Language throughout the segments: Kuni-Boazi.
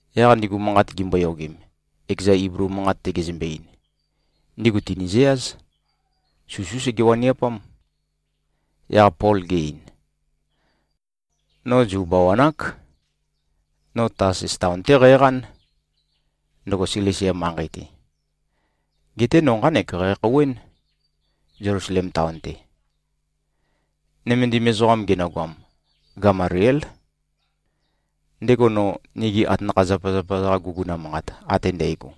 Yaq ndigu manqat gimboyogem, ekeza Iblu manqat-te gezømbe-ein, ndigu tìnizøyáz. Susú sege-waniapám. Yaq Pol ge-ein, “No Zu bawan-ák. No Tasus taon-té qæqán, ndøgo Silisia manqei-te. Geté no nqánek qækhouwén, Zelusalem taon-te. Nømendim ezoqam genøgoam, Gamaliél. Ndego no nigi atanakha-zapazapa-za-qa guguna manqat ate ndægo,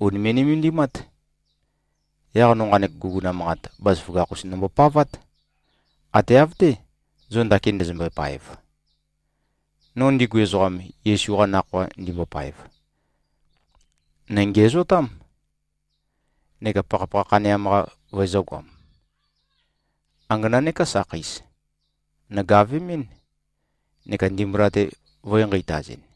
ùnime꞉-nømendimát. Yaq no nqanek guguna manqat, bazaføgakh-us nombopavát. Ate av-té, zo ndakin ndøzømbøe-paev. No ndigu ezoqam, Yesu-qa Nakhoa ndimbopaev, nø̀ngiæzotám, neka pakhapakha khaneam-qa vøezø̄goam. Angana neká sakheis, nògavemɨ́n neka ndimbula-te vø̄e-nqeitazɨn.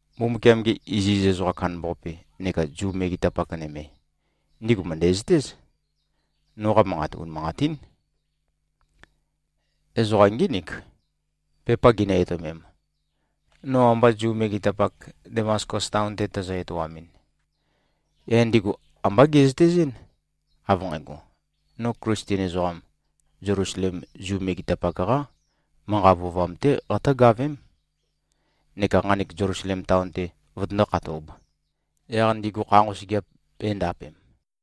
Mbumbukiam-ge iziz ezoqam kandambaqape neka Zu megetapak nøme, ndigu mø̀ndæzøtéz, noqa manqat unimanqatín. Ezoqa ngínik, pepa ginø-etøomem, no amba Zu megetapak, Damaskus taon-te tæzø-etoamɨn. Yaq ndigu ambá gezøtezɨ́n, av nqægo, no Klisten ezoqam, Zelusalem Zu megetapak-qá manqa vøovam-té qatǿgavém, neka nqanek Zelusalem taon-te vøtøndó-khatōb, yaq ndigu kha nqosøgeap bēndapem.”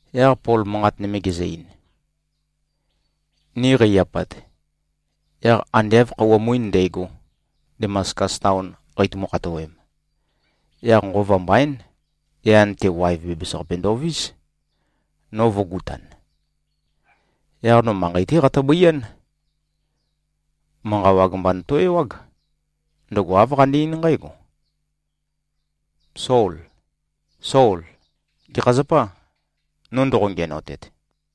Yaq Pol manqat nøme gezø-ein, “Ni qei-apat, yaq ande av khøuwa muin ndægo, Damaskus taon qeitumu-khatoem, yaq nqova mbaín, yan-te waev bæbæs-qape ndovís, no vø̄gutan. Yaq no manqei-té qatøbøián. Manqa wag mba noto-ewág. Ndøgo āv qane-eín nqǽgo, ‘Sol! Sol! Gekha zapâ, no ndoqo-ngiænotet?’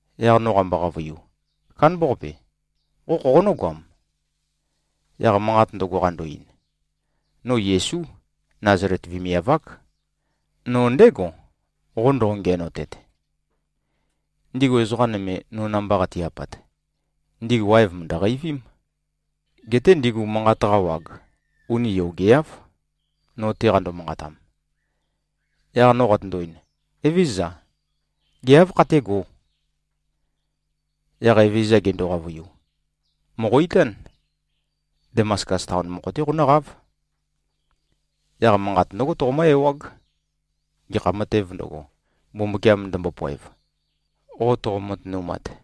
Yaq no qambo-qavøiu, ‘Kándambaqape. Qo khoqonǿ-goam?’ Yaq manqat ndøgo, qando-ein, ‘No Yesú. Nazalet vemiav-ák. No ndégo, qo ndoqo-ngiænotet.’ Ndigu ezoqa nøme, no namba qati-apat, ndigu waev mø̀ndø-qeivím. Geté ndigu manqat-qa wag uni yogeáv, no-te qando-manqatam. Yaq no qatøndo-ein, ‘Evézøza. Gê, áv khatégō?’ Yaq Evezøza gendo-qavøiu, ‘Mòqo-itán. Damaskus taon mokho-té qonǿqáv. Yaq manqat ndǿgo toqomǿ-ewág, gekha matēv ndøgo, Mbumbukiam ndømbopoev, qo toqo-matønumat.’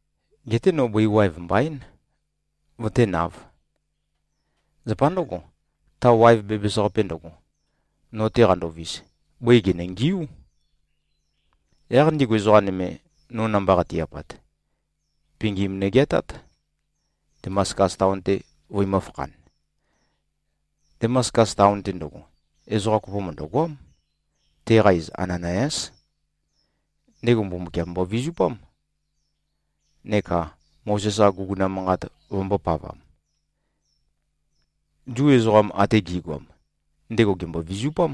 Geté no bøi waev mbaín, vøténāv. Zapa ndǿgo, ta waev bæbæs-qape ndøgo, no-te qandovis, bøi gènøngiú. Yaq ndigu ezoqa nøme, no namba qati-apat, pingim nøgeatát, Damaskus taon-te vøimø̄-fakhan. Damaskus taon-te ndøgo, ezoqa kopo mø̀ndøgoám. Teqa iz Ananayás. Ndego Mbumbukiam mbovizupám neka Mozes-qa guguna manqat vømbōpavam. Zu ezoqam ate gi꞉goam, ndego gèmbo-vizupám.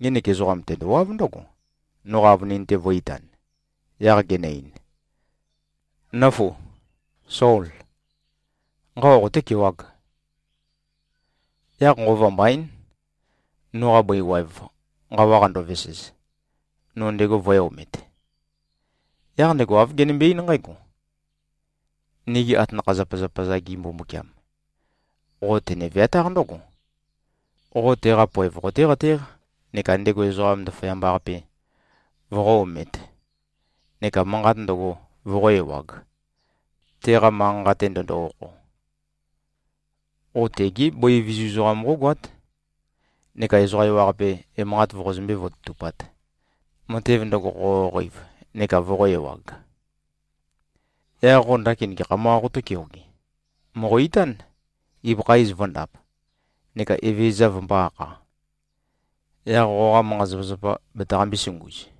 Ngenek ezoqam, tendowáv ndǿgo, noqa avønin-te vø̄-itan, yaq genø-ein, ‘Nǿfu! Sól! Nqawa qotékewāg!’ Yaq nqova mbaín, noqa bøi waev nqawa qandovesez, no ndego vø̄e-omet. Yaq ndego āv genømbe-eín nqǽgo, ‘Nigi atanakha-zapazapa-za-gi Mbumbukiam, qo tene-veatáq ndǿgo: Qo teqa poev qotéqatéq neka ndego Ezoqam Ndaføyamba-qape voqó-omēt neka manqat ndøgo voqó-ewāg, teqa manqa-nqa-te ndøndo-okho. Qo tegé bøi vizu ezoqam qógoát neka ezoqa ewaqape emanqat voqozømbé-vototupāt, matev ndøgo qoqoqeiv neka voqō-ewag. Yaq qo ndakin gekham-qā qotó-keoge? Mòqo-itán, ibøkha iz vø̄ndap, neka Evezøza vømbō-akha. Yaq qoqa manqa-zapazapa, betaqambē-sunguz.’”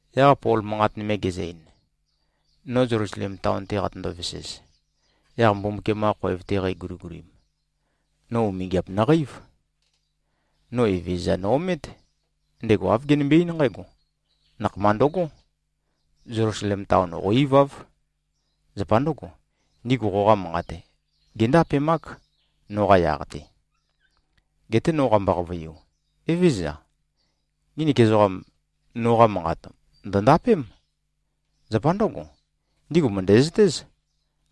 Yaq Pol manqat nøme gezø-ein, “No Zelusalem taon-te qatøndo-vesez, yaq Mbumbukiam-qa khoev-te qæguligulim, no umingiap nøqeív. No Evezøza no-omét. Ndego āv genømbe-eín nqǽgo, ‘Nakhama ndøgó! Zelusalem taon qó-iváv. Zapa ndǿgo, ndigu qoqa manqat géndapemák, noqa yaq-te.’ Geté no qambo-qavøiu, ‘Evézøza. Nginik ezoqam noqa manqat ndø̀ndapém. Zapa ndǿgo, ndigu mø̀ndæzøtéz,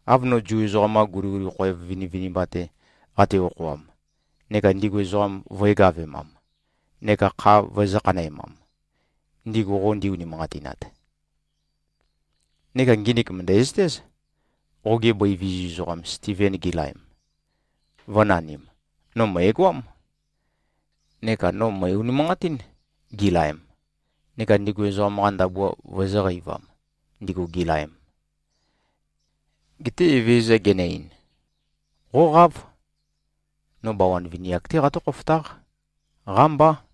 av no Zu ezoqam-qa guliguli khoev vinivinimba-te qate-okhoam, neka ndigu ezoqam vø̄e-gavemam neka kha vøezø̄-khanæmam, ndigu qo ndi-unimanqatinat. Neka nginik mø̀ndæzøtéz. Qoge bøi vizu ezoqam Stiven gilaem, vø̄nanim, no mø̀egoám. Neka no mø̀e-unimanqatín, gilaem, neka ndigu ezoqam-qa ndabua vøezø̄-qeivam, ndigu gilaem.’ Geté Evezøza genø-ein, ‘Qóqáv! No bawan vini-ak-té qatǿ-khofotáq. Qámbá.’”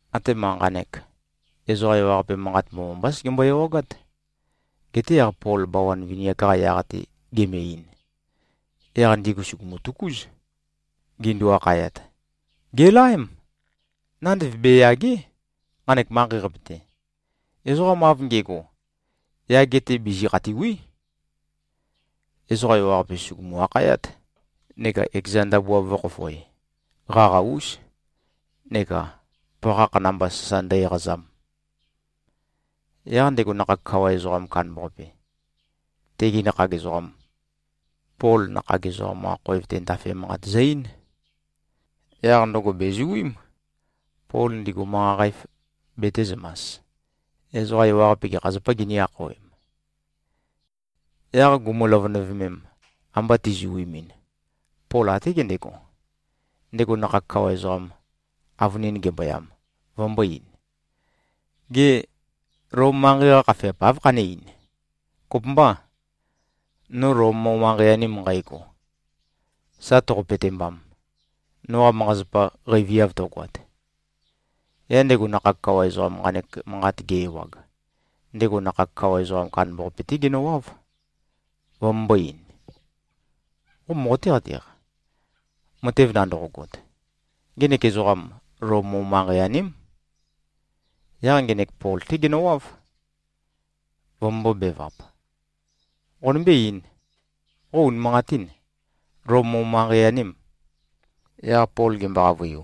Atema nqanek, ezoqa ewaqape manqat mbomambá segembo-ewagát. Geté yaq Pol bawan vini-ak-qa yaq-te geme-ein, yaq ndigu sùgumu-tøkúz, gindu-akhayat, “Gèlaém! Nandev beyàge᷄, nqanek manqei-qape-te. Ezoqam av nge꞉go, yage-te bizi-khatìwi᷄.” Ezoqa ewaqape, sùgumu-akhayát, neka ekeza ndabua vø̄khofoe, qaqa-ús, neka pakhakh namba sasa ndø-eqazam. Yaq ndego nakhag kawa ezoqam kandambaqape, tegi nakhag ezoqam, Pol nakhag ezoqam-qa khoev-te ndafe manqat zø-eín. Yaq ndøgo bèzuím, Pol ndigu manqa qæf betēzømas, ezoqa ewaqape gekha zapā ginī-akhawem. Yaq gumu-løvønøvemem, amba tizuimin, Pol até gendego, ndego nakhag kawa ezoqam, avønin gemboyam, vømbō-ein, “Gê, Lom manqei-qa khafeap áv khané-ein? Kopømbâ, no Lom mo-manqei-anem nqægo, sa toqo-petembam, noqa manqa-zapa qeiviav tøgoat?” Yaq ndego nakhag kawa ezoqam nqanek manqat ge-ewag, ndego nakhag kawa ezoqam kandambaqape-té genøwáv, vømømbō-ein, “Qo moqoté-qateq, matev nandoqogot? Ngenek ezoqam, Lom mo-manqei-aném.” Yaq ngenek Pol-té genøwáv, vømømbō-bevap, “Qonømbé-eīn. Qo unimanqatîn, Lom mo-manqei-anèm?” Yaq Pol gembo-qavøiu,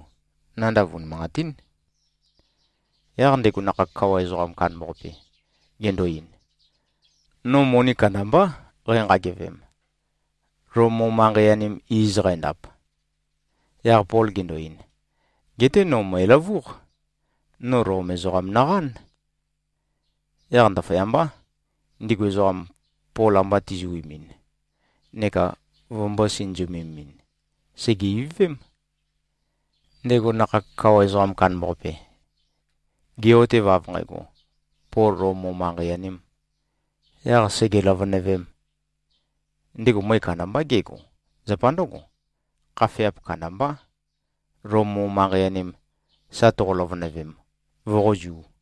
“Nandav unimanqatín.” Yaq ndego nakhag kawa ezoqam kandambaqape gendo-ein, “No moni kandambá qænqagevem, Lom mo-manqei-anem iz qændap.” Yaq Pol gendo-ein, “Geté no. Mø̀eløvúq. No Lom ezoqam noqán.” Yaq ndaføyambá, ndigu ezoqam, Pol amba tizuimin neka vømbō-sinøzømemɨn, sège-ivøvém. Ndego nakhag kawa ezoqam kandambaqape, ge꞉-otev, av nqægo, Pol Lom mo-manqei-anēm, yaq sège-løvønøvēm, ndego møe kandambá gego. ⌞Zapa ndǿgo, khafeap kandambá, Lom mo-manqei-anem sa toqo-løvønøvem, voqózū.⌟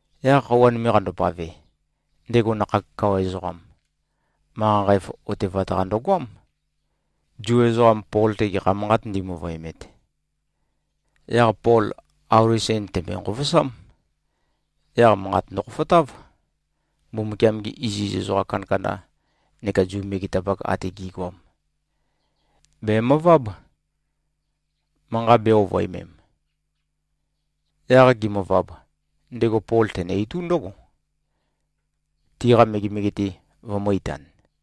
Yaq khøuwa nøme qandopave, ndego nakhag kawa ezoqam, manqa qæf otevat-qa ndøgoám, Zu ezoqam Pol-te gekha manqât ndimøvøemet. Yaq Pol auli sen tèmbøe-nqovosám. Yaq manqat ndøkhofotáv. Mbumbukiam-gi iziz ezoqa kandakanda neka Zu megetapak ate gi꞉goam, bèmøváb, manqa bē-ovøemem. Yaq gimøvab, ndego Pol tenø-itú ndǿgo, tiqa megemege-te vømø̄-itan.